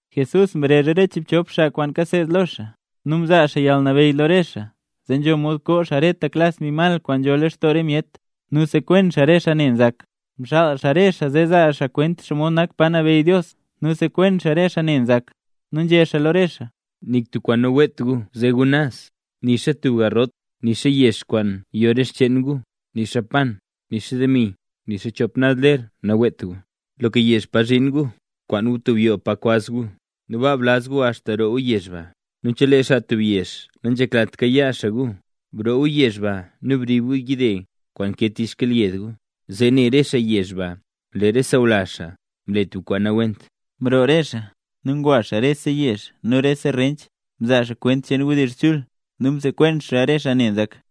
Jesús mrezh re chiibchop xaa kwaan kaseed lo xaa, nu mzaa xaa yalnabeyy lo re xaa zee nzho mod koo xaa reta klas mbi mal kwaan nzho lextoo re myet, nu sekwen xaa re xaa ne nzak. Mxaal xaa re xaa zee zaa xaa kwent xomod nak pa nabeyy Dios nu sekwen xaa re xaa ne nzak. Nu nzhé xaa lo re xaa: —Nik tub kwaan naweet gu ze gu naz, nixa tub garrot, nixa yex kwaan yo re xcheen gu, nixa pan, nixa demi, nixa chop naz ler naweet gu. Loka yezh pa zhin gu kwaan gu tub yoo pa kwaz gu, nu baa blaz gu axta roo gu yezh ba. Nu chelee xaa tub yezh nanzheklat kayaa xaa gu, broo gu yezh baa nu brib gu yide kwaan ke tich xkyelyed gu, zee ne re xaa yezh ba lee re sawlazh xaa mle tub kwaan nawent. Zee mroo re xaa, nu ngwa re xaa rese yezh nu rese rench, mzaa xaa kwent cheen wdizh chul nu msekwen xaa re xaa ne nzak.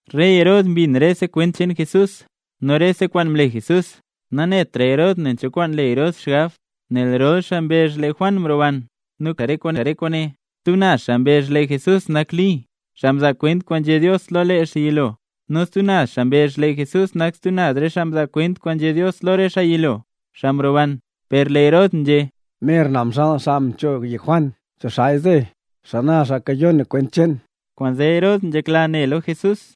Rey Herod mbin rese kwent cheen Jesús nu rese kwaan mle Jesús. Nanetra Herod nen cho kwaan le Herod xgab, nel rol xaa mbezh lee Juan mroban, nu kale xaa re kwaane. Stub naz xaa mbezh lee Jesús nak Li, xaa mzaa kwent kwaan nzhé Dios lo lee xaa yilo; nu stub naz xaa mbezh lee Jesús nak stub re xaa mzaa kwent kwaan nzhé Dios lo re xaa yilo, xaa mroban. Per lee Herod nzhé: —Mer na mxaal xaa mchoog yek Juan. ¿Cho xaaya zeey? ¿Xana xaa kayon na kwent cheen? Kwaanzee Herod nzhekla ne lo Jesús.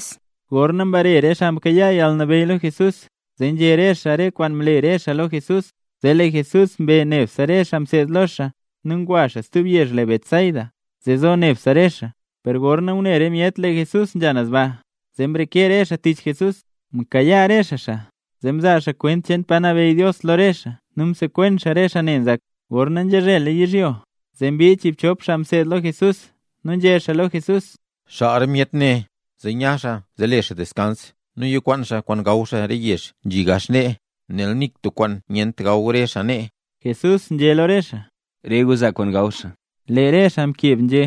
Gorna mbare re xaa mkayaa yalnabeyy lo Jesús, zee nzhé re xaa kwaan mle re xaa lo Jesús. Zee lee Jesús mbe nebse re xaa mseed lo xaa nu ngwa xaa stub yezh le Betsaida, zee zo nebse re xaa. Per gorna ngune re myet lee Jesús nzha naz ba, zee mreke re xaa tich Jesús. Mkayaa xaa re xaa, zee mzaa xaa kwent cheen pa nabeyy Dios lo re xaa nu msekwen xaa re xaa ne nzak. Gorna nzhazhela yizhyo, zee mbii chiibchop xaa mseed lo Jesús nu nzhé xaa lo Jesús: —Xaal re myet ne, zee nya xaa zee le xaa deskans nu yikwaan xaa kwaan gaw xaa re yezh nzhi gax nee; nel nik tub kwaan nyent gaw re xaa nee. Jesús nzhé lo re xaa: —Re gu zaa kwaan gaw xaa. Lee re xaa mkeb nzhé: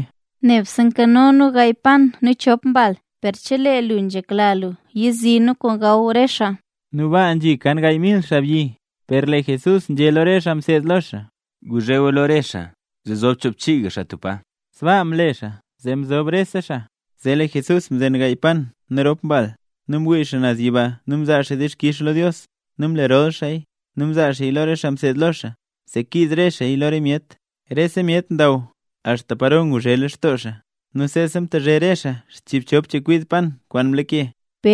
—Nik tub kwaan nankanot nu nee, nebse gaay pan nu chop mbal, per chelee lu nzhekla lu yizi nu kwaan gaw re xaa. Nu baa nzhi kan gaay mil xaabyi. Per lee Jesús nzhé lo re xaa mseed lo xaa: —Guzh re gu lo re xaa zee zob choobchiiga xaa tub pa. Sbaa mle re xaaya, zee mzob rese xaa. Zee lee Jesús mzen gaay pan nu rop mbal, nu mwii xaa naz yiba nu mzaa xaa dixkix lo Dios, nu mle rol xaaya nu mzaa xaaya lo re xaa mseed lo xaa, zee kiiz re xaaya lo re myet. Rese myet ndaw axta paro ngulo nguzhe lextoo re xaa. Nu seesa mtazhe re xaa zchiibchop chekwid pan kwaan mlake.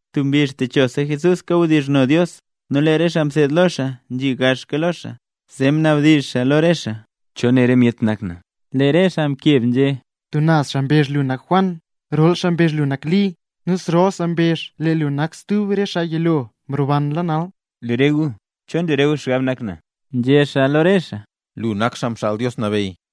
Tub mbizh techosa Jesús kawdizhno Dios. Nu lee re xaa mseed lo xaa nzhi gaxka lo xaa, zee mnabdizh xaa lo re xaa: —¿Cho né re myet nak na? Lee re xaa mkeb nzhé: —Tub naz xaa mbezh lee lu nak Juan Xaa Nchubnis, stub naz xaa mbezh lee lu nak Li, nu stub naz xaa mbezh lee lu nak stub re xaa mzaa kwent kwaan nzhé Dios lo lee xaa yilo, mrobanla nal. —Lee re gu, ¿cho nle re gu xgab nak na? —nzhé xaa lo re xaa. Nu lee Pér mkeb nzhé: —Lu nak Xaa Mxaal Dios Nabeyy.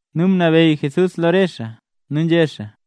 Nu mnabeyy Jesús lo re xaa nu nzhé xaa: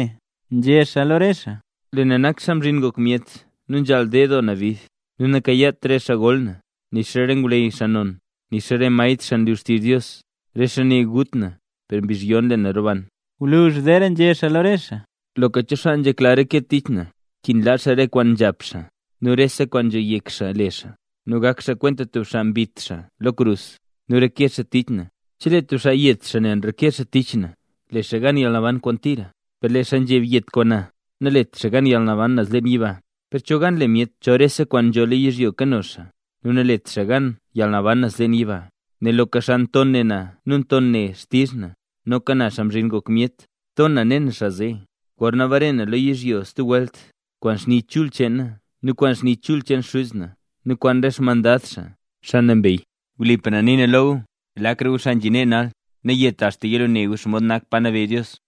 —nzhé xaa lo re xaa—. Lee na nak Xaa Mzhin Ngok Myet, nu nzhaal ded doo na bid. Nu nakayaat re xaa gol na, nixa re ngwleyy xaa non, nixa re maestr xaa nlu xtizh Dios. Re xaa ne gut na, per mbizh yon lee na roban. Gwluzh zeera nzhé xaa lo re xaa: —Loka cho xaa nzhekla reke tich na, nkin laa xaa rese kwaan nzhap xaa, nu rese kwaan nzho yek xaa le xaa, nu gak xaa kwenta tub xaa mbit xaa lo krus, nu reke xaa tich na. Chelee tub xaa yet xaa nel nreke xaa tich na, le xaa gan yalnaban kwaan tira. Per lee xaa nzheb yet kwaan na, nalet xaa gan yalnaban naz leen yiba. ¿Per cho gan le myet chol rese kwaan nzho lo yizhyo nkano xaa, nu nalet xaa gan yalnaban naz leen yiba? Nel loka xaa nton ne na nu ton ne xtizh na; noka na, Xaa Mzhin Ngok Myet, ton na ne na xaa zee, gorna bare na naz lo yizhyo stub welt, kwaan xni chul cheen na nu kwaan xni chul cheen Xuz na nu kwaan re xmandad xaa, xaa nambey. Wlipa na nii na lo gu, lakra gu xaa nzhi nee nal, nayeta axta yilo ne gu xomod nak pa nabeyy Dios.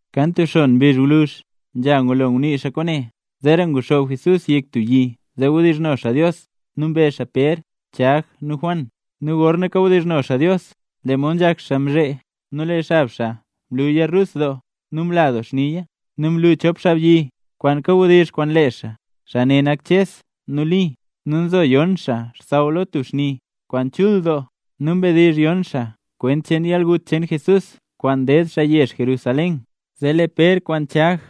Kan tub xon mbizh ngwluzh, nzha ngulo ngunii xaa kwaane, zeera nguxoob Jesús yek tub yi zee wdizhno xaa Dios. Nu mbe xaa Pér, Chag, nu Juan. Nu gorna kawdizhno xaa Dios, lee mod nzhak xaa mzhee, nu lee xab xaa mluya rus doo nu mla doo xniya. Nu mlu chop xaabyi, kwaan kawdizh kwaan lee xaa. Xaa ne nak Ches nu Li. Nu nzo yon xaa xsaww lo tub xni kwaan chul doo nu mdizh yon xaa kwent cheen yalgut cheen Jesús kwaan ded xaa yezh Jerusalén. Zee lee Pér kwaan Chag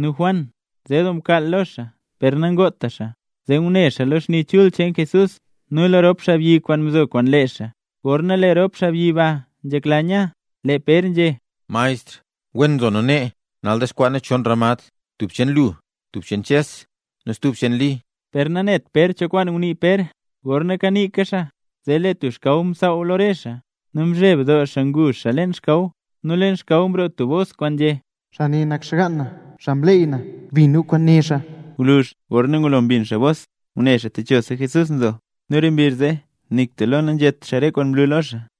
nu Juan nze doo mkaal lo xaa per nangota xaa, zee ngune xaa lo xni chul cheen Jesús nu lo rop xaabyi kwaan mzo kwaan lee xaa. Gorna lee rop xaabyi ba nzhekla nya, lee Pér nzhé: —Maestr, ¡wen nzo nu nee! Nal dexkwaa nu chon ramad: tub cheen lu, stub cheen Ches, nu stuba cheen Li. Per nanet Pér cho kwaan ngunii Pér. Gorna kaniika xaa, zee lee tub xkaw msaaw lo re xaa, nu mzheb doo xaa ngu xaa leen xkaw. Nu leen xkaw mroo tub bos kwaan nzhé: —Xaa ne nak xgaan na, xaa mleey na. Bin gu kwaan né xaa. Gwluzh gorna ngulo mbin xaa bos, ngune xaa techosa Jesús nzo. Nu re mbizh zee nik tub lo nanzhét xaa re kwaan mlu lo xaa.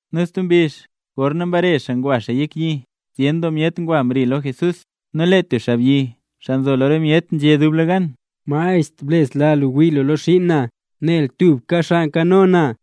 Nu lee stub mbizh, gorna mbare xaa ngwa xaa yek yi, zyen doo myet ngwa mri lo Jesús. Nu lee tub xaabyi, xaa nzo lo re myet, nzhé dublegan: —Maestr, blesla lu wii lo xiin na, nel tubka xaa nkano na.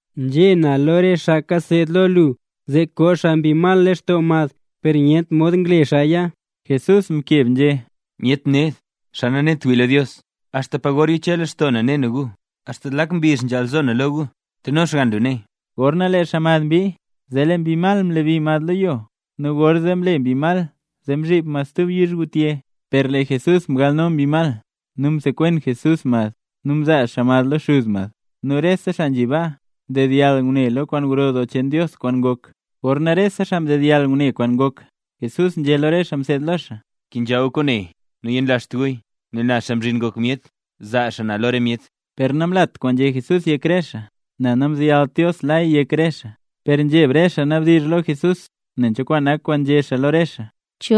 Nzhé naya lo re xaa kaseed lo lu, zee koo xaa mbi mal lextoo mad, per nyent mod ngle xaaya. Jesús mkeb nzhé: —Myet xaa ned, xaa nanet wii lo Dios. ¿Axta pa gor yiche lextoo na ne na re gu? ¿Axta zlak mbizh nzhaal zo na lo re gu? Teno xgann lu nee. Gorna lee xaa mad mbii, zee lee mbi mal mlebi mad lo yo, nu gorzee mle mbi mal zee mzhib mad stub yizhgutye. Per lee Jesús mgalno mbi mal, nu msekwen Jesús mad, nu mzaa xaa mad lo xuz mad. Nu rese xaa nzhi baa, mdedyall ngune lo kwaan gro doo cheen Dios kwaan ngok. Gorna rese xaa mdedyall ngune kwaan ngok, Jesús nzhé lo re xaa mseed lo xaa: —Wen bkenzha gu kwaane nu nanyenlazht guya; nel na, Xaa Mzhin Ngok Myet, zaa xaa na lo re myet. Per namlat kwaan nzhé Jesús yek re xaa, nel namzeyalt Dios laya yek re xaa. Per nzheb re xaa nabdizh xaa lo Jesús nen cho kwaan nak kwaan nzhé xaa lo re xaa.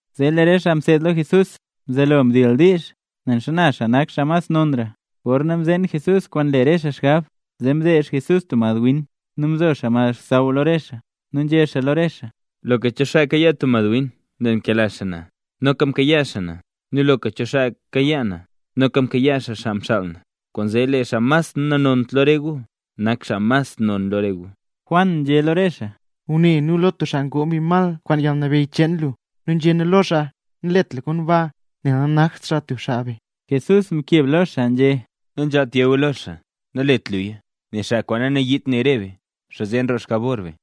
Zee lee re xaa mseed lo Jesús mzelo ndildiizha nen xana xaa nak xaa mas xaa nonra. Gorna mzeen Jesús kwaan nle re xaa xgab, zee mdezh Jesús tub madwin, nu mzo xaa mad saaw lo re xaa. Nu nzhé xaa lo re xaa: —Loka cho xaa kayaa tub madwin nel nkela xaa na, noka mkayaa xaa na; nu loka cho xaa kayaa na, noka mkayaa xaa xaa mxaal na. Kwaanzee lee xaa mas nanont lo re gu, nak xaa mas non lo re gu. Juan nzhé lo xaa: —Maestr, ngune nu lo tub xaa ngoo mbi mal kwaan yalnabeyy cheen lu, nu nzhé nu lo xaa: “Nalet lu komba”, nel nanakt xaa tub xaa be. Jesús mkeb lo xaa nzhé: —Nanzhaalt yé gu lo xaa: “Nalet luya”, nel xaa kwaan nanayiit ne re be, xaa zee nroo xjabor re be.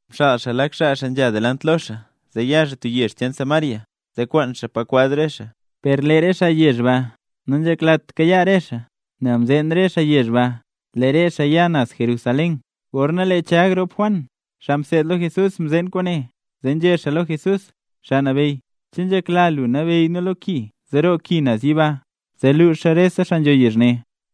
Mxaal xaa lak xaa xaa nzha delant lo xaa, zee ya xaa tub yezh cheen Samaria zee kwaan xaa pa kwaz re xaa. Per lee re xaa yezh ba nanzheklat kayaa re xaa, nel mzeen re xaa yezh ba, lee re xaa ya naz Jerusalén. Gorna lee Chag rop Juan, xaa mseed lo Jesús, mzeen kwaane, zee nzhé xaa lo Jesús: —Xaa Nabeyy, ¿che nzhekla lu nabeyy nu lo ki zee roo ki naz yiba, zee luuxa re xaa nzho yezh ne?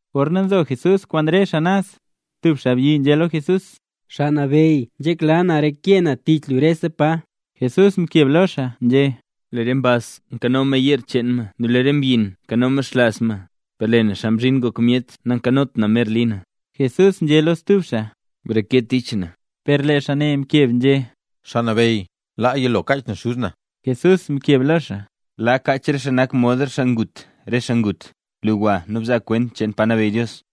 Gorna nzo Jesús kwaan re xaa naz, tub xaabyi nzhé lo Jesús: —Xaa Nabeyy, nzhekla na reke na tich lu rese pa ya lu. Jesús mkeb lo xaa nzhé: —Lee re mbaz nkano ma yeer cheen ma nu lee re mbyin nkano ma xlaaz ma; per lee na, Xaa Mzhin Ngok Myet nankanot na mer li na. Jesús nzhé lo stub xaa: —Breke tich na. Per lee xaa ne mkeb nzhé: —Xaa Nabeyy, laa yilo kaach na xuz na. Jesús mkeb lo xaa: —Laa kaach re xaa nak mod tub xaa ngut re xaa ngut. Lu, gwa nu bzaa kwent cheen pa nabeyy Dios.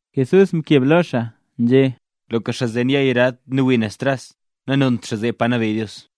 Jesús mkeb lo xaa nzhé: —Loka xaa zen yaa yarad nu wii xaa naz tras, nanont xaa zee pa nabeyy Dios.